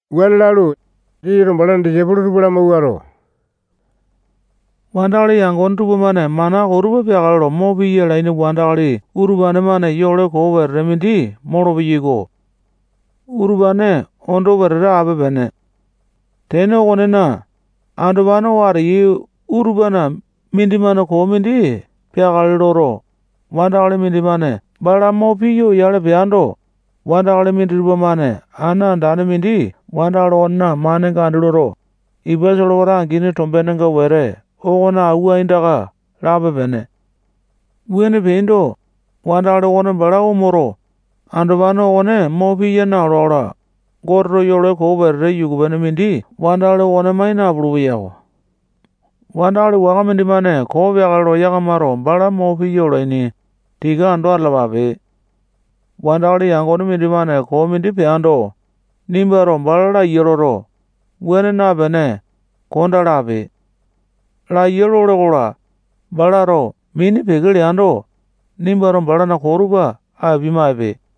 Wuane lalu, Jisasato balana disaipolo tupa lamawuato, wandakali yangone tupamane mana koo tupa peakale lo mo piya alaini wandakali utupane-mane yole koo wete mindi molopeyai-ko. Utupane ondo wetete ape-pene. Tene okonena, andopane oo ateyai utupana mindimane koo mindi peakale loto, wandakali mindimane bala mo piya oyale peando, wandakali minditupa-mane ana andane mindi wandakali okonena manenga andi loto, ipa solewata angini tombenga wete okona awua aindaka lape-pene. Wuane peaindo, wandakali okone bala omoto, andopane okone mo piya naola-kola, Goteto yole koo wetete yuku-pene mindi wandakali okone mai napulu-peyako. Wandakali waka mindimane koo peakale lo yakamato bala mo piya olaini, tika ando atalapape. Wandakali yangone mindimane koo mindi peando, nimbato bala laiya loto, wuane napene, kondaa lape. Laiya lole-kola, balato mini peke leando, nimbato balana koo tupa apia-maipe.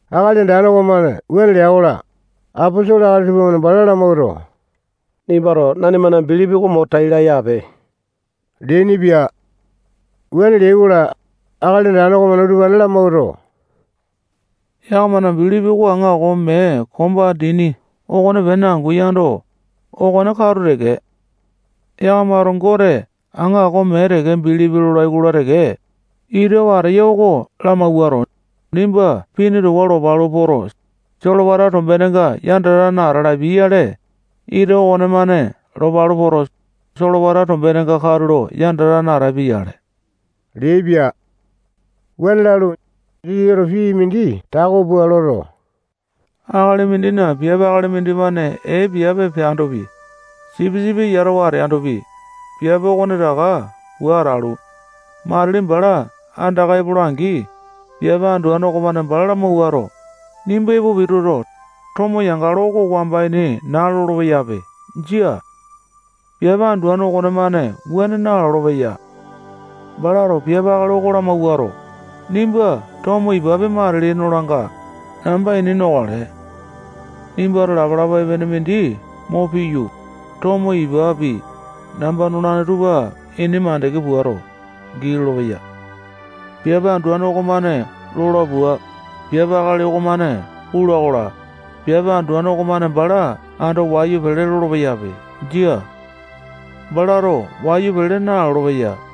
Akali Andane okomane wuane lea-kola, aposolo akali tupamane bala lamawuato, nimbato nanimana bilipi oko mo tai laya ape leainipia. Wuane leai-kola, Akali Andane okomane utupane lamawuato, yakamana bilipi oko aŋako mee komba dini okonepene angu yando, okone katu teke. Yakamato Gote aŋako mee teke bilipi lolai-kola teke, ita oo ateya oko lamawuato, nimba pini towa lopalu poto, solewata tombenenga yandatane ata lapiai-yale, ita okonemane lopalu poto, solewata tombenenga katulo yandatane atapia-yale leaipia. Wuane lalu, Jisasato pii mindi tako pua loto, akali mindina piape akali mindimane ee piape peandopi, sipisipi yatawa ateandopi, piape okonetaka pua atalu, matili bala andaka epola-angi, piape anduane okomane bala lamawuato, nimba epo pituto, tomo yangalo oko wamba ini naa lolo-peyape. Jia. Piape anduane okonemane wuane nalolo-peya. Balato piape akali oko lamawuato, nimba tomo ipapi, matili nolanga, namba ini nokale. Nimbato lapalapa epene mindi mo piyu, tomo ipapi, namba nolane tupa ini mandeke puato, gii lolopeya. Piape anduane okomane lola pua, piape akali okomane pula-kola, piape anduane okomane bala ando wayu pele lolo-peyape. Jia. Balato wayu pele nalolo-peya.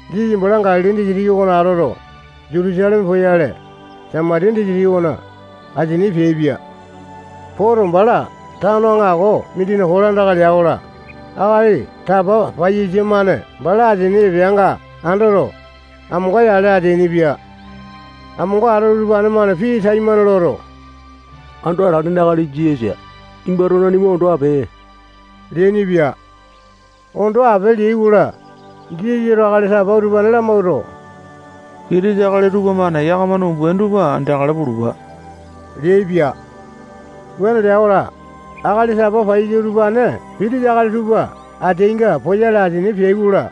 Jisasa bala Galili disitiki okona atoto, Jutusaleme poyale, Samatiya disitiki okona asini peaipia. Poto, bala tano aŋako mindina kolandaka lea-kola, akali tapa paiyasa-mane bala asini epeanga andoto, amonga-yale ateainipia. Amonga atoto, utupane-mane pii taimane loto, Ando Atalene Akali Jisasa, nimbato nanima ondo ape leainipia. Ondo ape leai-kola, Jisasato akali tapa utupane lamawuato, pitisa akali tupamane yakamana umbaini tupa andeakale pulupa leaipia. Wuane lea-kola, akali tapa paiyasa utupane pitisa akali tupa ateainga poyale, asini peai-kola,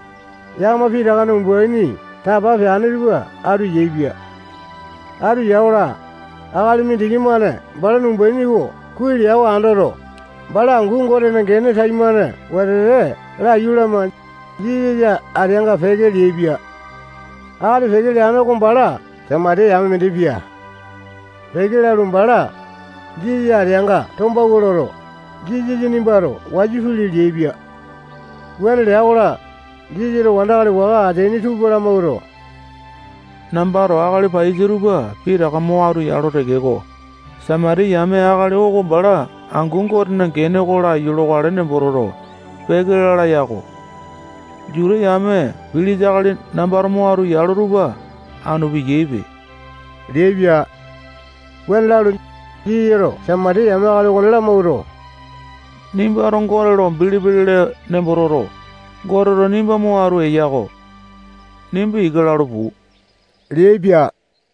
yakama pitakana umbaini tapa peane tupa atu yaepia. Atu ya-kola, akali mindiki-mane balana umbaini oko kuai lea oko andoto, bala angu Gotena gene taimane wetete laiyu lama, Jisasa ateanga peke leaipia. Akali peke leane oko bala Samatiya yame mindi pia. Peke lalu, bala Jisasa ateanga tombawua loto, Jisasa nimbato wayu pili leaipia. Wuane lea-kola, Jisasato wandakali waka ateaini tupa lamawuato, nambato akali paiyasa tupa pitaka mo atu yalo tekeko, Samatiya yame akali oko bala angu Gotena gene oko laiyu lokale nembo toto, peke lala yako. Juta yame pilisa akali nambato mo atu yalo tupa anu piyaipe leaipia. Wuane lalu, Jisasato Samatiya yame akali okone lamawuato, nimbato Gote lo bilipi lele nembo toto, Goteto nimba mo atu eya-ko. Nimba ika lalu, puu leaipia.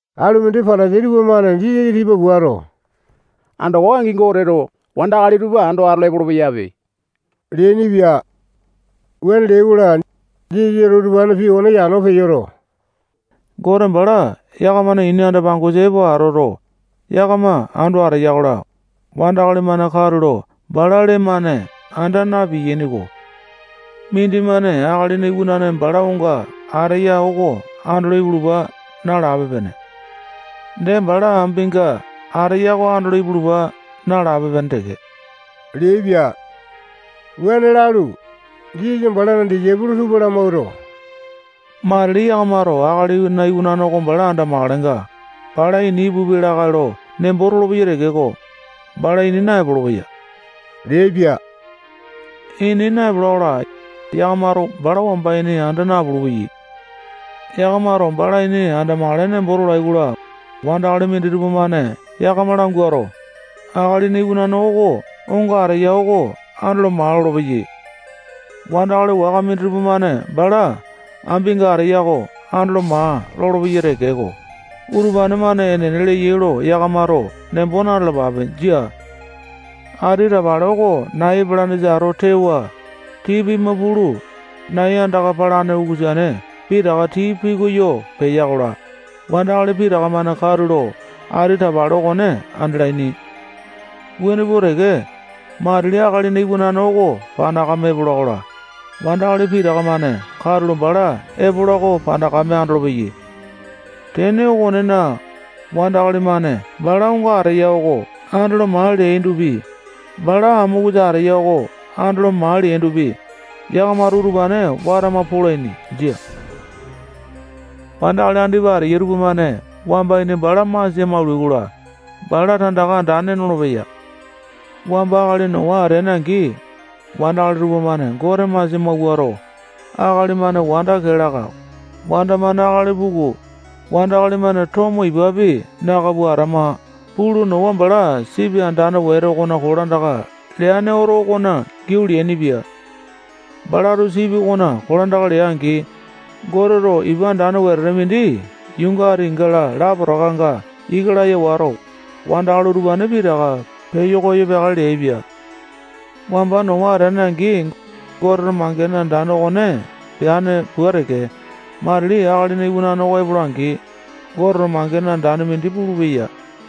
Alumindi Patasai tupamane Jisasa tipa puato, andoko angi Goteto wandakali tupa ando atolo epolo-peyape leainipia. Wuane leai-kola, Jisasato utupanena pii okone yano peyoto, Gote bala yakamana ini anda-pangosa epo atoto, yakama ando ateya-kola, wandakali-mane katulo bala lee-mane anda na-piyainiko. Mindimane Akalina Iwanane bala onga ateya oko andolo ipulupa nalape-pene. Dee bala ambinga ateya oko andolo ipulupa nalape-pene teke leaipia. Wuane lalu, Jisasa balana disaipolo tupa lamawuato, matili yakamato Akalina Iwanane oko andamakalenga, bali ini ipupia lakae lo nembo tolopeyai tekeko, bala ini naepolo-peya leaipia. Ini naepola-kola, yakamato bala wamba ini anda napulu-peyai. Yakamato bala ini andamakale nembo tolai-kola, wandakali minditupa-mane yakama languato, Akalina Iwanane oko onga ateya oko andolo maa lolopeyai. Wandakali waka minditupa-mane bala ambinga ateya oko andolo maa lolopeyai tekeko, utupane-mane enene leyai lo yakamato nembo na-talapape. Jia. Ati tapale oko nai epalanesa ato tewa, tii pima pulu, nai andaka palane ukusane pitaka tii piyoko peya-kola, wandakali pitaka-mane katulo ati tapale okone andalaini. Wuane pua teke, matili Akalina Iwanane oko panakame epola-kola, wandakali pitaka-mane katulo bala epola oko panakame andolopeyai. Tene okonena, wandakali-mane bala onga ateya oko andolo maa leaindopi, bala amokusa ateya oko andolo maa leaindopi, yakamato utupane watama polaini. Jia. Wandakali andipa ateyai tupamane wamba ini bala masia maulai-kola, bala tandaka andane nolopeya. Wamba akali Nowa ateane-angi, wandakali tupamane Gote masia mawuato, akali-mane wanda kee laka, wanda-mane akali puku, wandakali-mane tomo ipapi naka pua atama pulu, Nowa bala sipi andane wete okona kolandaka leane oto okona giau leainipia. Balato sipi okonena kolandaka lea-angi, Goteto ipa andane wetete mindi yuunga atinga lapotakanga ika laya wato, wandakali utupane pitaka peyo peakale peaipia. Wamba Nowa ateane-angi, Goteto mangene andane okone peane pua teke, matili Akalina Iwanane oko epola-angi, Goteto mangene andane mindi pulupeya.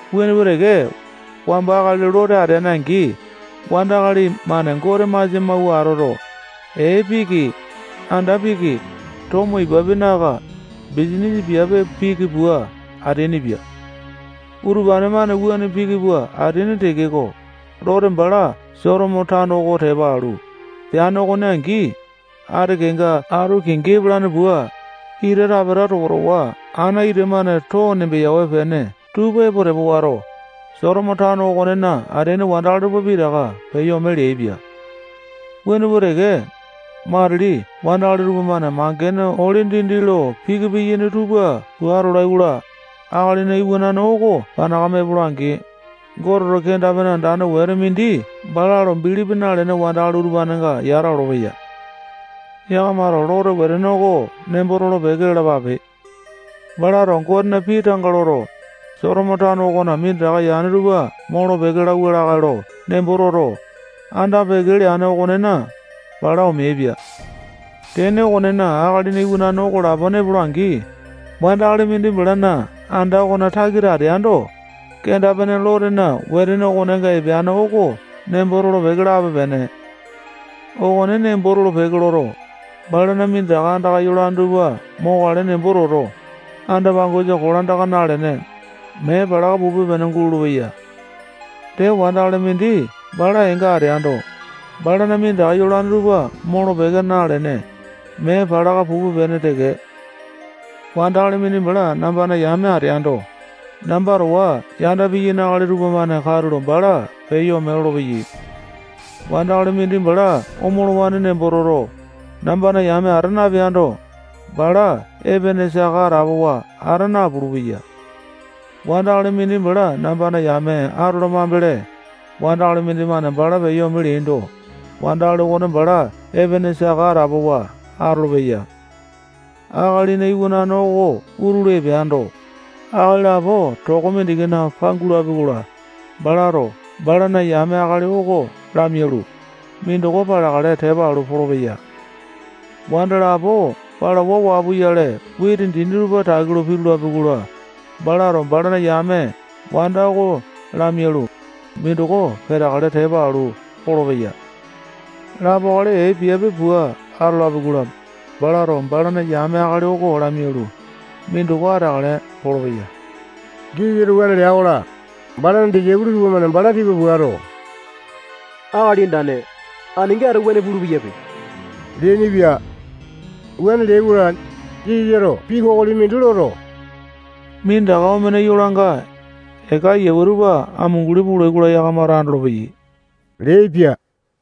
Wuane pua teke, wamba akali Lote ateane-angi, wandakali-mane Gote masia mawua atoto, ee piki, anda piki, tomo ipapi naka, bisanisa piape piki pua ateainipia. Utupane-mane wuane piki pua ateaini tekeko, Lote bala Sotomo tano oko tepa alu, peane okone angi, ati kenga ato kingi epalane pua, ita tapeta towa-towa ana ita-mane too nembeyawe-pene tupa epo tepa wato, Sotomo tano okonena ateaini wandakali tupa pitaka peyo ome leaipia. Wuane pua teke, matili wandakali tupamane mangene ole dindi lo piki piyaini tupa pua atolai-kola, Akalina Iwanane oko panakame epola-angi, Goteto kenda-pene andane wetete mindi bala lo bilipi nalene wandakali utupanenga yata olopeya. Yakamato Lotena wetene oko nembo tolo-peke lalapape. Balato Gotena pii tanga loto, Sotomo tano okona minditaka yane tupa molo-peke lauwa lakae lo nembo toto, anda-peke leane okonena, bala omeaipia. Tene okonena, Akalina Iwanane oko lapone epola-angi, wandakali mindi balana anda okona takita ateando, kenda-pene Lotena wetene okonenga epeane oko nembo tolo-peke lape-pene. Okone nembo tolo-peke loto, balana minditaka andaka yolane tupa mokale nembo toto, anda-pangosa kolandaka nalene, mee palaka pupe-pene gulolo-peya. Dee, wandakali mindi bala eenga ateando, balana minditaka yolane tupa molo-peke nalene, mee palaka pupe-pene teke. Wandakali mindi bala nambana yame ateando, namba towa yanda piyaini akali tupamane katulo bala peyo ome lolopeya. Wandakali mindi bala omolowane nembo toto, nambana yame ata napeando, bala epene saka atapowa ata napulu-peya. Wandakali mindi bala nambana yame atola mambele, wandakali mindimane bala peyo ome leando, wandakali okone bala epene saka atapowa atolopeya. Akalina Iwanane oko utulu epeando, akali lapo toko mindikina pangulapi-kola, balato balana yame akali oko lamialu, mindoko paleakale tepa alu polopeya. Wanda lapo palawa waa puyale witi dini tupa taki lo pitulapi-kola, balato balana yame wanda oko lamialu, mindoko peteakale tepa alu polopeya. [Lapo akali ee piape pua atolapi-kola, balato balana yame akali oko lamialu, mindoko ateakale polopeya.] Jisasato wuane lea-kola, balana disaipolo tupamane bala tipa puato, Akali Andane, aninga ato wuane pulu-peyape leainipia. Wuane leai-kola, Jisasato pii kokoli mindi loto, minditaka omene yuu yolanga, eka ayiawe tupa amunguli pulai-kola, yakamato andolopeyai leaipia.